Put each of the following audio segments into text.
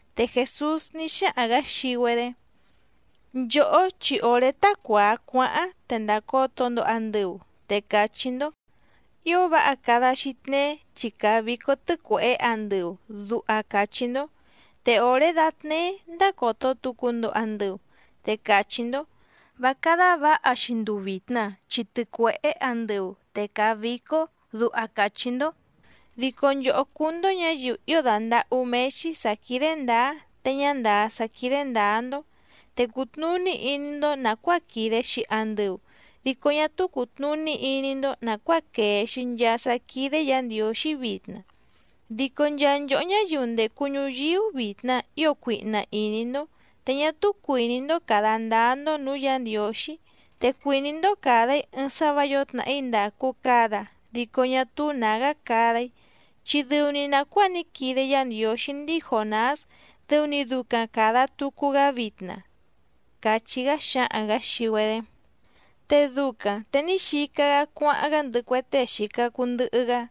Te Jèsús ní xáhaⁿ‑gǎ xii‑güedé: —Nchòhó chi òré tá cuàa cuáháⁿ te ndàcoto‑ndo andɨu, te càchí‑ndó: “Ío váha cada‑xi tneé chi càa vícó tɨ́cuèhé andɨu”, duha càchí‑ndó. Te òré dátnéé ndácòto tucu‑ndo andɨu, te càchí‑ndó: “Vá cádá vǎha‑xi nduu vìtna chi tɨcuèhé andɨu, te càa vícó”, duha càchí‑ndó. ¡Dico nchòhó cúú‑ndó ñǎyiu ío dàndahú méé‑xí sǎ quídé ndǎá te ñá ndàá sá quídé ndǎá‑ndó! Te cùtnuní iní‑ndó nàcuáa quìde‑xi andɨu, dico ñá túú cùtnuní iní‑ndó nàcuáa quèe‑xi nchaa sá quídé Yǎ Ndiǒxí vitna. Dico nchaa nchòhó ñáyiu ndècu ñuyíú vitna ío cuihna ìní‑ndó, te ñá túú cuìní‑ndó càda ndáá‑ndó nǔú Yǎ Ndiǒxí, te cuìní‑ndó càda‑í ɨɨⁿ sá vǎ yǒo tnàhí ndàcu cada dico ñá túú nǎgá cada‑í, chi dɨu‑ni nàcuáa ní quide Yá Ndiǒxí ndíi Jònás dɨu‑ni ducaⁿ càda tucu‑gá vitna —càchí‑gá xǎhaⁿ‑gǎ xii‑güedé. Te ducaⁿ te ní xica‑gá cuáháⁿ‑gá ndɨhɨ cue tée xìca cuu ndɨhɨ‑gá.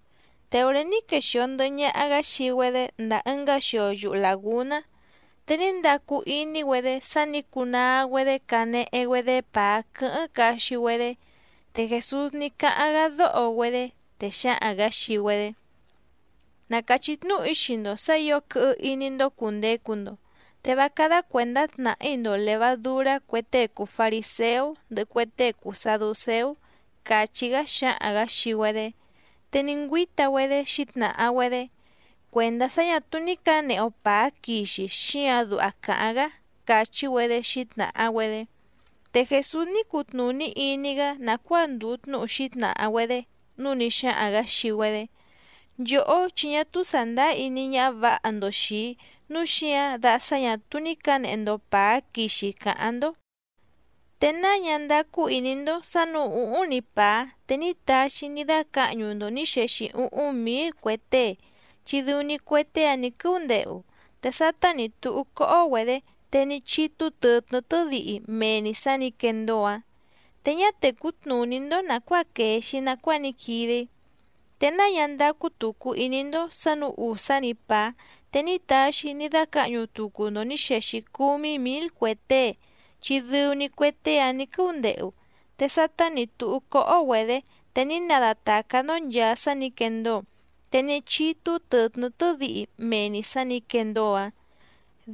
Te òré ní quexìo ndɨhɨ ñaha‑gá xii‑güedé ndàa ɨngá xio yuhu làgúná, te ní ndacu iní‑güedé sá nǐ cunaa‑güedé canehe‑güedé pàá quɨ́hɨ́ⁿ caxi‑güedé. Te Jèsús ní cáháⁿ‑gá dóho‑güedé, te xǎhaⁿ‑gǎ xii‑güedé: —Na càchí tnúhu‑í xii‑ndo sǎ ǐo quɨhɨ iní‑ndó cùndecu‑ndo, te vá cádá cuèndá tnàhí‑ndo lèvadurá cue tée cùu fariséú ndɨhɨ cue tée cùu saducéú —càchí‑gá xǎhaⁿ‑gǎ xii‑güedé. Te ní ngüíta‑güedé xǐtnàha‑güedé: —Cuèndá sá ñà túú ní cǎnehe‑o pàá quixi xíǎⁿ duha càháⁿ‑gá —càchí‑güedé xǐtnàha‑güedé. Te Jèsús ní cutnùní iní‑gá nàcuáa ndùu tnúhu xǐtnàha‑güedé, núu ní xáhaⁿ‑gǎ xii‑güedé: —Nchòhó chi ñá túú sàndáá iní ñáhá vǎha‑ndo xìi‑í nǔu xíǎⁿ da sá ñà túú ní cǎnehe‑ndo pàá quixi càháⁿ‑ndó. ¿Te náa ñá ndácú ìní‑ndó sǎ nǔú ùhúⁿ‑ni pàá, te ní taxi‑í ní dácǎhñu‑ndo nǐ xexi úhúⁿ mǐl cue tée, chi dɨu‑ni cue tée‑áⁿ nǐ quɨ́úndehu, te sátá nǐ túhú cóhó‑güedě te ní chítú tɨ̀tnɨ́ tɨ́dihi mee‑ni sǎ nǐ quendóo‑ǎⁿ? Te ñá tècú tnùní‑ndó nàcuáa quèe‑xi nacuáa ní quide‑í. ¿Te náa ñá ndácú tùcu iní‑ndó sǎ nǔú ùsá‑ni pàá te ní taxi‑í ní dácǎhñu tucu‑ndo nǐ xexi cúmí mǐl cue tée, chi dɨu‑ni cue tée‑áⁿ nǐ quɨ́úndehu, te sátá nǐ túhú cóhó‑güedě te ní nadatàcá‑ndó nchàa sá nǐ quendóo, te ní chítú tɨ̀tnɨ́ tɨ́dihi mee‑ni sǎ nǐ quendóo‑ǎⁿ?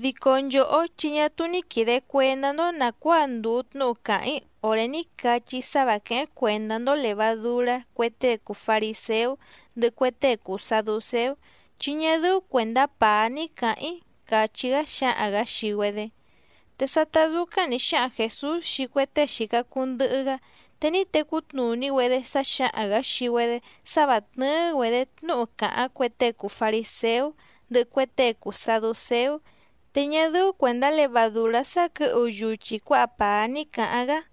Dico nchòhó chi ñá túú ní quìde cuendá‑ndó nàcuáa ndùu tnúhu càháⁿ‑í òré ní cachí‑í sá vǎ quéhéⁿ cuèndá‑ndó lèvadurá cue tée cùu fariséú ndɨhɨ cue tée cùu saducéú, chi ñá dɨ́ú cuèndá pàá ní cǎháⁿ‑í —càchí‑gá xǎhaⁿ‑gǎ xii‑güedé. Te sátá dúcáⁿ nǐ xáhaⁿ Jèsús xii cue tée xìca cuu ndɨhɨ‑gá, te ní tecú tnùní‑güedé sá xǎhaⁿ‑gǎ xii‑güedé sá vǎ tnɨ́ɨ́‑güedě tnúhu càháⁿ cue tée cùu fariséú ndɨhɨ cue tée cùu saducéú, te ñá dɨ́ú cuèndá levadùrá sá quɨ̌hu yuchi cuǎha pàá ní cǎháⁿ‑gá.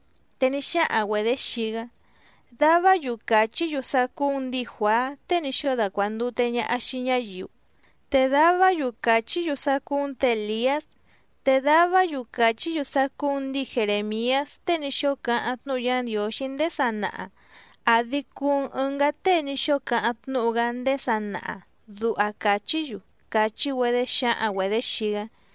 Te ní xáhaⁿ‑güedě xii‑gá: —Davá‑yu càchí‑yu sá cúú‑n ndǐi Juàá tée ní xóo dacuàndute ñaha xii ñáyiu, te davá‑yu càchí‑yu sá cúú‑n tě Èliás, te davá‑yu càchí‑yu sá cúú‑n ndǐi Jerèmiás tée ní xóo cáháⁿ tnúhu Yá Ndiǒxí ndéé sanaha, àdi cuu‑n ɨngá tée ní xóo cáháⁿ tnúhu‑gá ndéé sanaha, duha càchí‑yu —càchí‑güedé xǎhaⁿ‑güedě xii‑gá.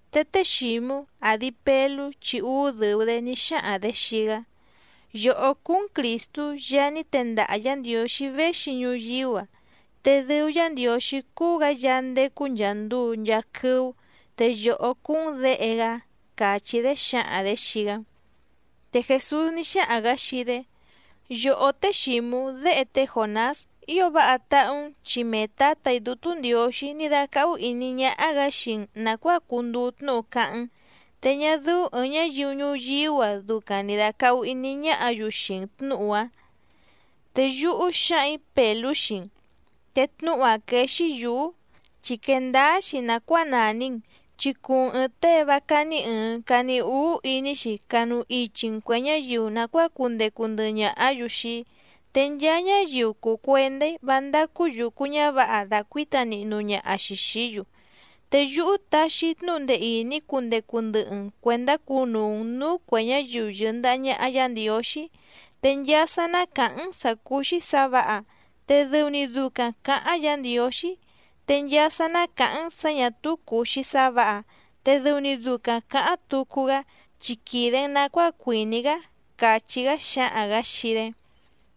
Te té Xǐmú, àdi Pelú chi úú dɨ̀u‑dé, ní xáhaⁿ‑dě xii‑gá: —Yòhó cúú‑n Crìstú Yaá ní tendaha Yǎ Ndiǒxí véxi ñuyíú‑a, te dɨu Yá Ndiǒxí cúú‑gǎ Yaá ndécú nchàa nduu nchaa quɨ́ú, te yòhó cúú‑n Děhe‑gá —càchí‑dé xǎhaⁿ‑dě xii‑gá. Te Jèsús ní xáhaⁿ‑gǎ xii‑dé: —Yòhó té Xǐmú déhe té Jònás, ío váha táhú‑n chi mee Tǎtà‑í Dútú Ndiǒxí ní dácáhú ìní ñáhá‑gǎ xii‑n nàcuáa cunduu tnúhu cáháⁿ‑n, te ñá dɨ́ú ɨ̀ɨⁿ ñáyiu ñuyíú‑a ducaⁿ ni dàcahu iní ñáhǎ‑yu xii‑n tnǔhu‑áⁿ. Te yúhú xǎhaⁿ‑ǐ Pèlú xii‑n, te tnúhu‑áⁿ quéé‑xí yǔú, chi quèe ndáá‑xi nàcuáa nàni‑n, chi cuu‑n ɨ̀ɨⁿ tée vá cání ɨ̀ɨⁿ cani úú iní‑xi canu ichi‑n cuè ñáyiu nàcuáa cundecu ndɨhɨ ñàhá‑yu xii‑í. Te nchaa ñáyiu cùu cuendá‑í vá ndácú yùcu ñávǎha dacuǐta nihnu ñaha‑xi xìí‑yu. Te yúhú taxi‑í tnúhu ndee ìní cundecu ndɨhɨ‑n cuèndá cunuu‑n nǔú cuè ñáyiu yɨ̀ndaha ñaha Yá Ndiǒxí, te nchaa sá ná càháⁿ‑n sǎ cúú‑xí sǎ vǎha, te dɨu‑ni ducaⁿ cǎháⁿ Yǎ Ndiǒxí, te nchaa sá ná càháⁿ‑n sǎ ñà túú cùu‑xi sá vǎha, te dɨu‑ni ducaⁿ cǎháⁿ tucu‑gá, chi quìde‑n nacuáa cuìní‑gá —càchí‑gá xǎhaⁿ‑gǎ xii‑dé.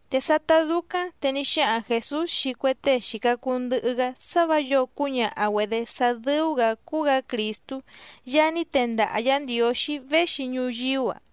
Te sátá dúcáⁿ te ní xáhaⁿ Jèsús xii cue tée xìca cuu ndɨhɨ‑gá sá vǎ yǒo cúñaha‑güedě sá dɨ́ú‑gǎ cúú‑gǎ Crìstú Yaá ní tendaha Yǎ Ndiǒxí véxi ñuyíú‑a.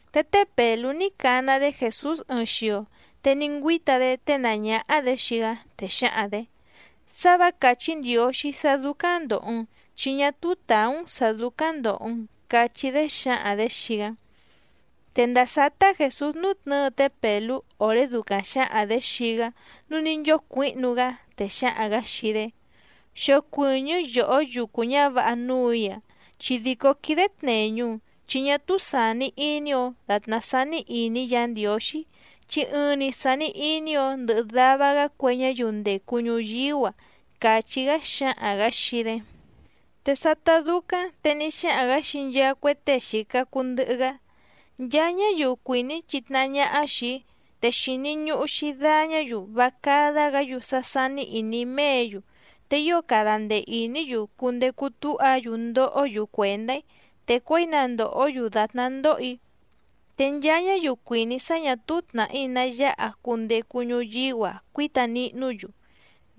Te té Pèlú ní cana‑dé Jèsús ɨɨⁿ xio, te ní ngüíta‑dé ténàá ñáhá‑dě xii‑gá, te xǎhaⁿ‑dě: —¡Sá vǎ càchí Ndiǒxí sá dúcáⁿ ndòho‑n chi ñá túú tàú‑n sǎ dúcáⁿ ndòho‑n! —cachí‑dé xǎhaⁿ‑dě xii‑gá. Te ndàa sátá Jèsús nútnɨ̌ɨ té Pèlú òré ducaⁿ xǎhaⁿ‑dě xii‑gá nǔu ní nchócuǐhnu‑gá, te xǎhaⁿ‑gǎ xii‑dé: —¡Xocuɨ̀ñɨ́ yòhó yucu ñǎvǎha núù‑í‑a chi dìcó quídé tnèñu‑n! Chi ñá túú sàni iní‑ǒ dàtná sání ìní Yǎ Ndiǒxí chi ɨɨⁿ‑ni sàni iní‑ǒ ndɨhɨ dava‑gá cue ñáyiu ndècu ñuyíú‑a —càchí‑gá xǎhaⁿ‑gǎ xii‑dé. Te sátá dúcáⁿ te ní xáhaⁿ‑gǎ xii nchaa cue tée xìca cuu ndɨhɨ‑gá: —Nchaa ñáyiu cuìní chitnahá ñáhá xìi‑í, te xìni ñuhu‑xi dañá‑yu vá cádá‑gǎ‑yu sá sání ìní méě‑yu, te ío cada ndee ìní‑yu cundecu túha‑yu ndohó‑yu cuèndá‑í, te cuěi na ndòhó‑yu dàtná ndoho‑í. Te nchaa ñáyiu cuìní sá ñà túú tnàhí ná yáha cundecu ñuyíú‑a cuíta nihnú‑yu,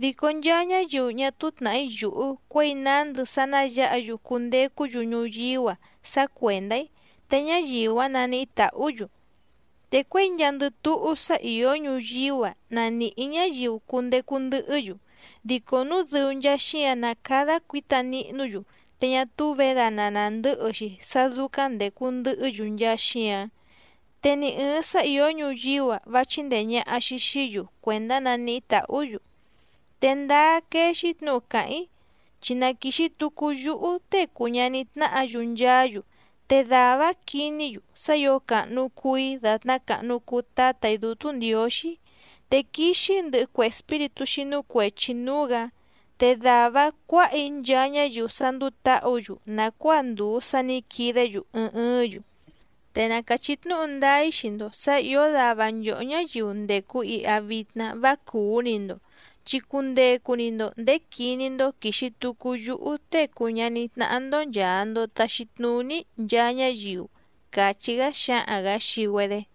dico nchaa ñáyiu ñá túú tnàhí yùhú cuěi nándɨ sá ná yǎha‑yu cundecú‑yu ñuyíú‑a sá cuèndá‑í, te ñáyiu‑áⁿ naníhí tàhú‑yu. Te cuěi nchaandɨ túhú sá ìó ñuyíú‑a na nìhí ñáyiu cundecu ndɨhɨ́‑yu, dico núu dɨu nchaa xíǎⁿ ná càda cuíta nihnú‑yu te ñá túú vědana nàndɨ́hɨ‑xi sá dúcáⁿ ndècu ndɨhɨ́‑yu nchaa xíǎⁿ. Te ni ɨ̀ɨⁿ sá ìó ñuyíú‑a vá chíndèe ñaha‑xi xií‑yu cuèndá naníhí tàhú‑yu. Te ndáá quéé‑xí tnǔhu càháⁿ‑í, chi na quìxi tucu yúhú Tée cùu ñaní tnáhǎ‑yu nchaá‑yu, te dàvá‑áⁿ quiní‑yu sá ǐo càhnu cuu‑í dàtná càhnu cuu Tátà‑í Dútú Ndiǒxí, te quixi‑í ndɨhɨ cue espíritú xínú cuèchi núú‑gǎ, te dàvá‑áⁿ cuǎha‑í nchaa ñáyiu sá ndúú tǎhǔ‑yu nàcuáa ndùu sá nǐ quidé‑yu ɨɨⁿ ɨɨ́ⁿ‑yu. Te na càchí tnúhu ndáá‑í xii‑ndo sǎ ìó dava nchòhó ñáyiu ndècu iha vitna vá cùú‑ni‑ndo, chi cundecu‑ni‑ndo ndèé quiní‑ndó quìxi tucu yúhú Tée cùu ñaní tnáhá‑ndó nchàa‑ndo taxi tnuní‑í nchaa ñáyiu —càchí‑gá xǎhaⁿ‑gǎ xii‑güedé.